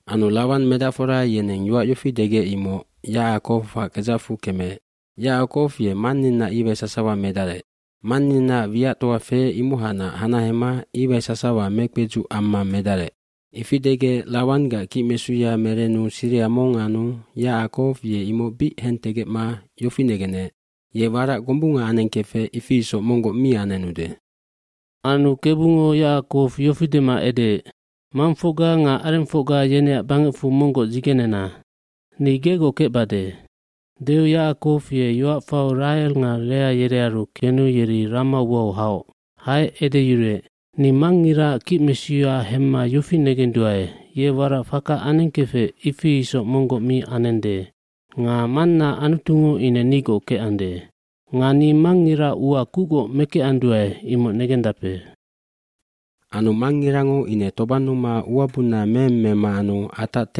Anu Lawan medacfora yeneng yoac yofi degec imoc Yacakowac kedzacfu kemeec. “Yacakow ye manninaac iwai sasawa medarec. Manniaac wiactoa feec imohacnac hanahema iwai sasawa mekpedzuc amma medarec.” Ifi degec Lawanggac kicmesuya merenu siriha mong anu Yacakow ye imoc bic hentegecma yofi negenec ye warac gombunga anengkefec ifi isoc monggoc mi anenude. aAnu Kebungo Yacakow yofi dema edeec, “Mangfocga nga arengfocga yeneac bangecfu monggoc dzigenena. Ni gegoc kecbade.” Deu Yacakow ye yoac fau Rahel nga Lea yerearu kenu yeri rama uau haoc. Haec edeyuruec, “Ni mangngiraac kicmesuya hemma yofi negenduae ye warac faka anengkefec ifi isoc monggoc mi anende. Nga mannaac Anutungo ine nigoc kecande. Nga ni mangngiraac ua kucgoc mekecanduae imoc negendape. bAnu mangngirango ine tobannuma ua bunna meeng mema anu atac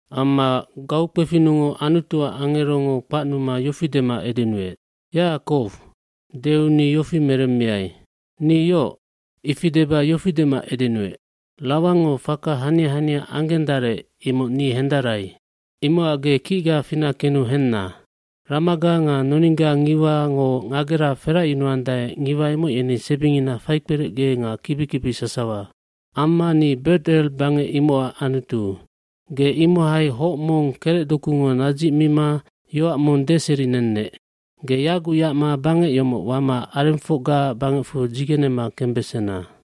Amma gaukpefinnungoc Anutuac angerongo kpacnuma yofi dema edenuec, “Yacakow.” Deu ni yofi meremmiai, “Ni yoc.” Ifi deba yofi dema edenuec, “Lawangngo faka hania hania anggendarec imoc ni hendarai. Imocac ge kicga fina kenu henna. Ramaga nga noningga ngiwango ngagera feracyunuandae ngiwa imoc yeni sebingina faikperecge nga kibi kibi sasawa. cAmma ni Bet El bangec imocac Anutu. Ge imohai hoc mong kerecdokungo nadzicmima yoac mong deserinennec. Ge yaguc yacma bangec yomoc wama arengfocgaac bangecfu dzigenema kembesena.”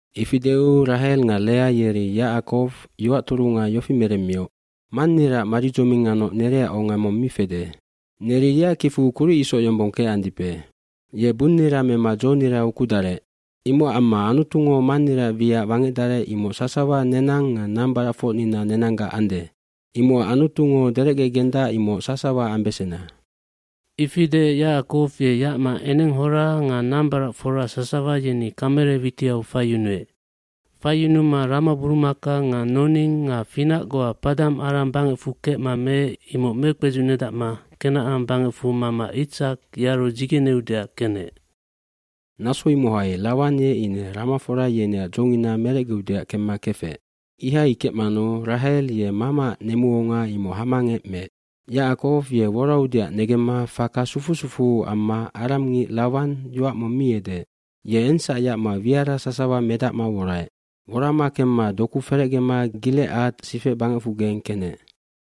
Ifi deu Rahel nga Lea yeri Yacakow yoac turunga yofi meremmioc, “Manniraac maridzoming nganoc nereac onga mong mi fede. Neri yeac kicfu kuric isoc yombong kecandipe. Ye bunnira mema dzonira ukudarec. Imocac amma Anutungo manniraac wiac wangecdarec imoc sasawa nenang nga nambaracfocnina nenanggac ande. Imocac Anutungo derecgegendac imoc sasawa ambesena.” Ifi deec Yacakow ye yacma enenghora nga nambaracfora sasawa yeni kamele witiau faiyunuec. Faiyunuma ramaburumaka nga noning nga finac goa Paddan Aram bangecfu kecma meec imoc mekpedzunedacma Kenacan bangecfu mama Itsak yearu dzigeneudeac kenec. dNaso imohai Lawan ye ine ramafora yeneac dzongina merecgeudeac kemma kefec. Ihai kecmanu Rahel ye mamaac nemuonga imoc hamangec meec. Yacakow ye woraudeac negemma faka sufu sufuu amma aramngic Lawan yoac mong mi edeec. fYe engsac yacma wiara sasawa medacma woraec. Worama kemma dokue ferecgema Gilecad sifecbangecfugeng kenec.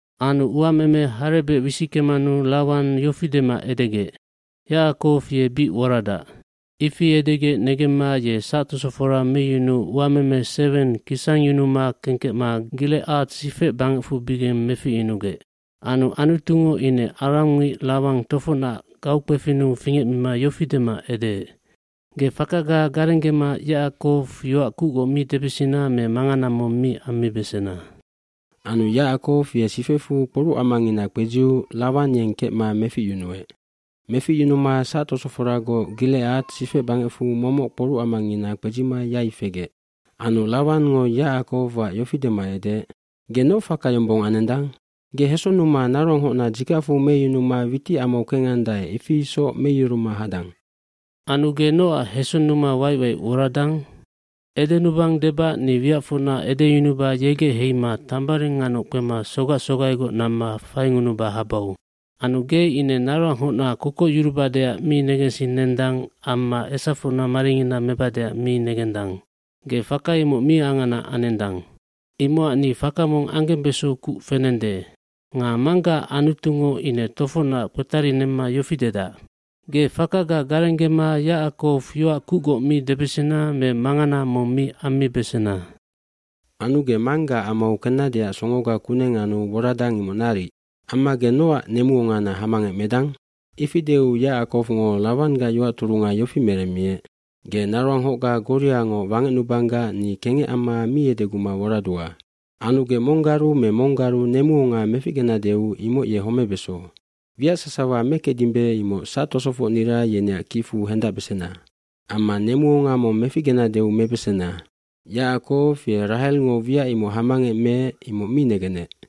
Anu uameme harebec wisickemanu Lawan yofi dema edegec, “Yacakow ye bic woradac.” Ifi edegec negemma ye sactosofora meyunuu uameme seweng kisangyunuma kengkecma Gilecad sifecbangecfubigeng meficyunugec. gAnu Anutungo ine aramngic Lawan tofocnac gaukpefinnu fingecmima yofi dema edeec, “Ge fakaga garenggema Yacakow yoac kucgoc mi debesena me mangana mong mi ammibesena.” Anu Yacackow ye sifecfu kporucamangina kpedziu Lawan yeng kengkecma meficyunuec. Meficyunuma sactosoforagoc Gilecad sifecbangecfu momoc kporucamangina kpedzima yai fegec. Anu Lawangngo Yacakowac yofi dema edeec, “Ge noc faka yombong anendang? Ge hesonnuma naroanghocna dzikacfu meyunuma witicamau kengandae ifi isoc meyuruma hadang. Anu ge nocac hesonnuma waic waic woradang? Edenubang debac ni wiacfocna edeyunuba yegec heima tambaring nganoc kpema sogac sogaigoc namma faingunuba habau. Anu ge ine naroanghocna kokocyurubadeac mi negensinendang amma esafocna maringina mebadeac mi negendang. Ge faka imoc mi angana anendang. hImocac ni faka mong anggembeso kuc fenende. Nga manggaac Anutungo ine tofocnac kpetarinemma yofi dedac. ‘Ge fakaga garenggema Yacakow yoac kucgoc mi debesena me mangana mong mi ammibesena.’ iAnu ge manggaac amau kennadeac songoga kuneng anu woradang imoc naric. Amma ge nocac nemuongana hamangec medang?” Ifi deu Yacakowngo Lawanggac yoac turunga yofi meremmiec, “Ge naroanghocga goriangoc wangecnubanggac ni kengec amma mi edeguma woradua. Anu ge monggaru me monggaru nemuonga meficgenadeu imoc ye homebeso. Wiac sasawa mekecdimbe imoc sactosofocnira yeneac kicfu hendacbesena. Amma nemuonga mong meficgenadeu mebesena.” Yacakow ye Rahelngo wiac imoc hamangec meec imoc mi negenec.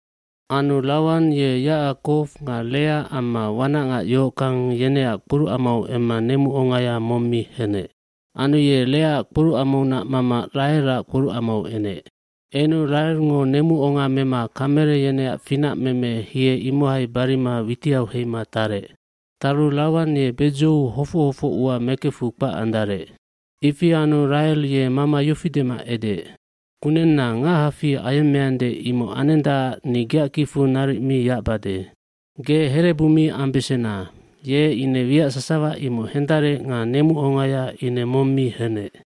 Anu Lawan ye Yacakow nga Lea amma wanacngac yohockang yeneac kporucamau emma nemuongaya mong mi henec. Anu ye Leaac kporucamaunac mama Rahelac kporucamau enec. Enu Rahelngo nemuonga mema kamele yeneac finac meme hie imohai barima witiau heima tarec. Taru Lawan ye bedzou hofoc hofoc ua mekefu kpac andarec. Ifi anu Rahel ye mama yofi dema edeec, “Kunenna ngachafi ayemmeande imoc anendacac ni geac kicfu naric mi yacbade.” Ge herebu mi ambesena. Ye ine wiac sasawa imoc hendarec nga nemuongaya ine mong mi henec.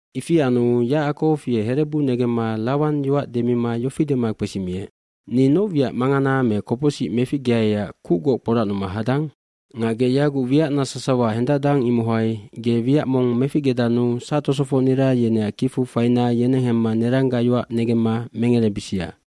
Ifi anu Yacakow ye herebu negemma Lawan yoac demima yofi dema kpesimiec, “Ni noc wiac mangana me kopocsic meficgeaiac kucgoc kporacnuma hadang? Nga ge yaguc wiacna sasawa hendacdang imohai ge wiac mong meficgedannu sactosofocnira yeneac kicfu faina yeneng hemma neranggac yoac negemma mengerebisia.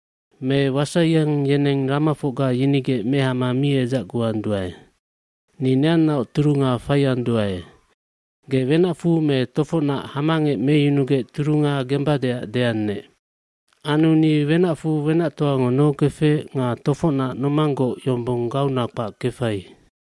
Me wasaiyang yeneng ramafocga yinigec mehama mi edzacguanduae. Ni neannaoc turunga faianduae. Ge wenacfu me tofocnac hamangec meyunugec turunga gembadeac deannec. Anu ni wenacfu wenactoango nohokefec nga tofocnac nomanggoc yombong gauna kpac kefai.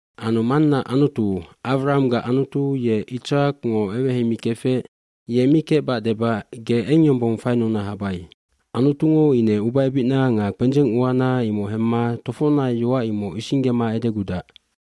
kAnu mannaac Anutu, Awrahamgac Anutu ye Itsakngo eweheimikefec ye mi kecbac debac ge eng yombong fainuna habai. Anutungo ine ubaebicna nga kpendzeng uana imoc hemma tofocnac yoac imoc isinggema edegudac.”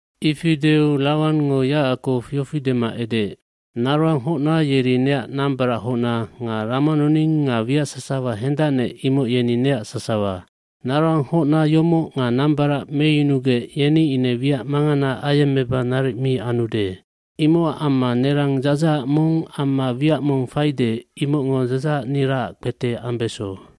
Ifi deu Lawangngo Yacakow yofi dema edeec, “Naroanghocna yeri neac nambarachocna nga ramanoning nga wiac sasawa hendacnec imoc yeni neac sasawa. Naroanghocna yomoc nga nambarac meyunugec yeni ine wiac mangana ayemmeba naric mi anude. Imocac amma nerang dzadzahac mong amma wiac mong faide imocngo dzadzahacniraac kpete ambeso.”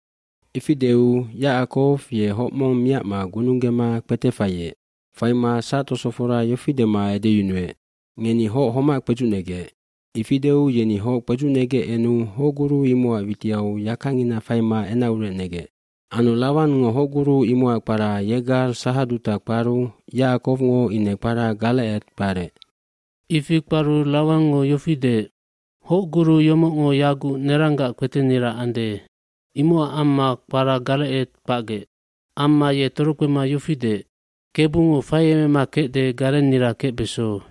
Ifi deu Yacakow ye hoc mong miacma gununggema kpete faiec. Faima sactosofora yofi dema edeyunuec, “Ngeni hoc homac kpedzucnegec.” Ifi deu yeni hoc kpedzucnegec enu hocguru imocac witiau yakangina faima enacurec negec. Anu Lawangngo hocguru imocac kpara Yegar Sahadutal kparu Yacakowngo ine kpara Galeced kparec. mIfi kparu Lawangngo yofi deec, “Hocguru yomocngo yaguc neranggac kpetenira ande.” Imocac amma kpara Galeced kpacgec. Amma ye torokpema yofi deec “Kebungo faiemema kecde garennira kecbeso.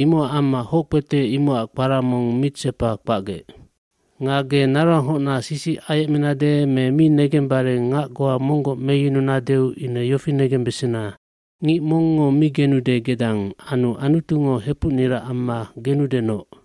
Imocac amma hockpete imocac kpara mong Mitsepan kpacgec. oNga ge naroanghocna sisic ayecmenade me mi negembare ngac goa monggoc meyununadeu ine yofi negembesena. Ngic mongngo mi genude gedang anu Anutungo hepucnira amma genudenoc.”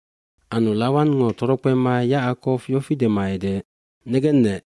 Anu Lawangngo torokpema Yacakow yofi dema edeec, “Negennec,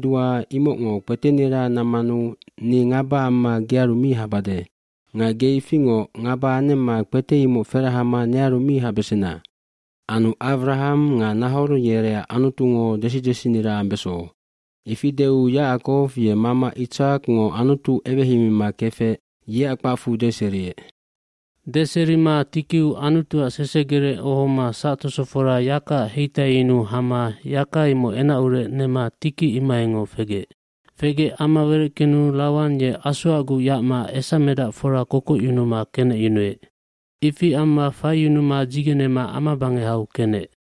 imocngo kpetenira nammanu ni ngaba amma gearu mi habade. Nga ge ifingoc ngaba anemma kpete imoc ferahama nearu mi habesena. pAnu Awraham nga Nahor yereac Anutungo desi desinira ambeso. Ifi deu Yacakow ye mama Itsakngo Anutu eweheimima kefec yeac kpacfu deseriec.” Deserima tikiu Anutuac sesegerec ohoma sactosofora yakaac heitaiyunu hama yaka imoc enacurec nema tiki imohaingoc fegec. Fegec ama wereckenu Lawan ye asoacguc yacma esamedacfora kokocyunuma kenecyunuec. Ifi amma faiyunuma dzigenema amabangehau kenec.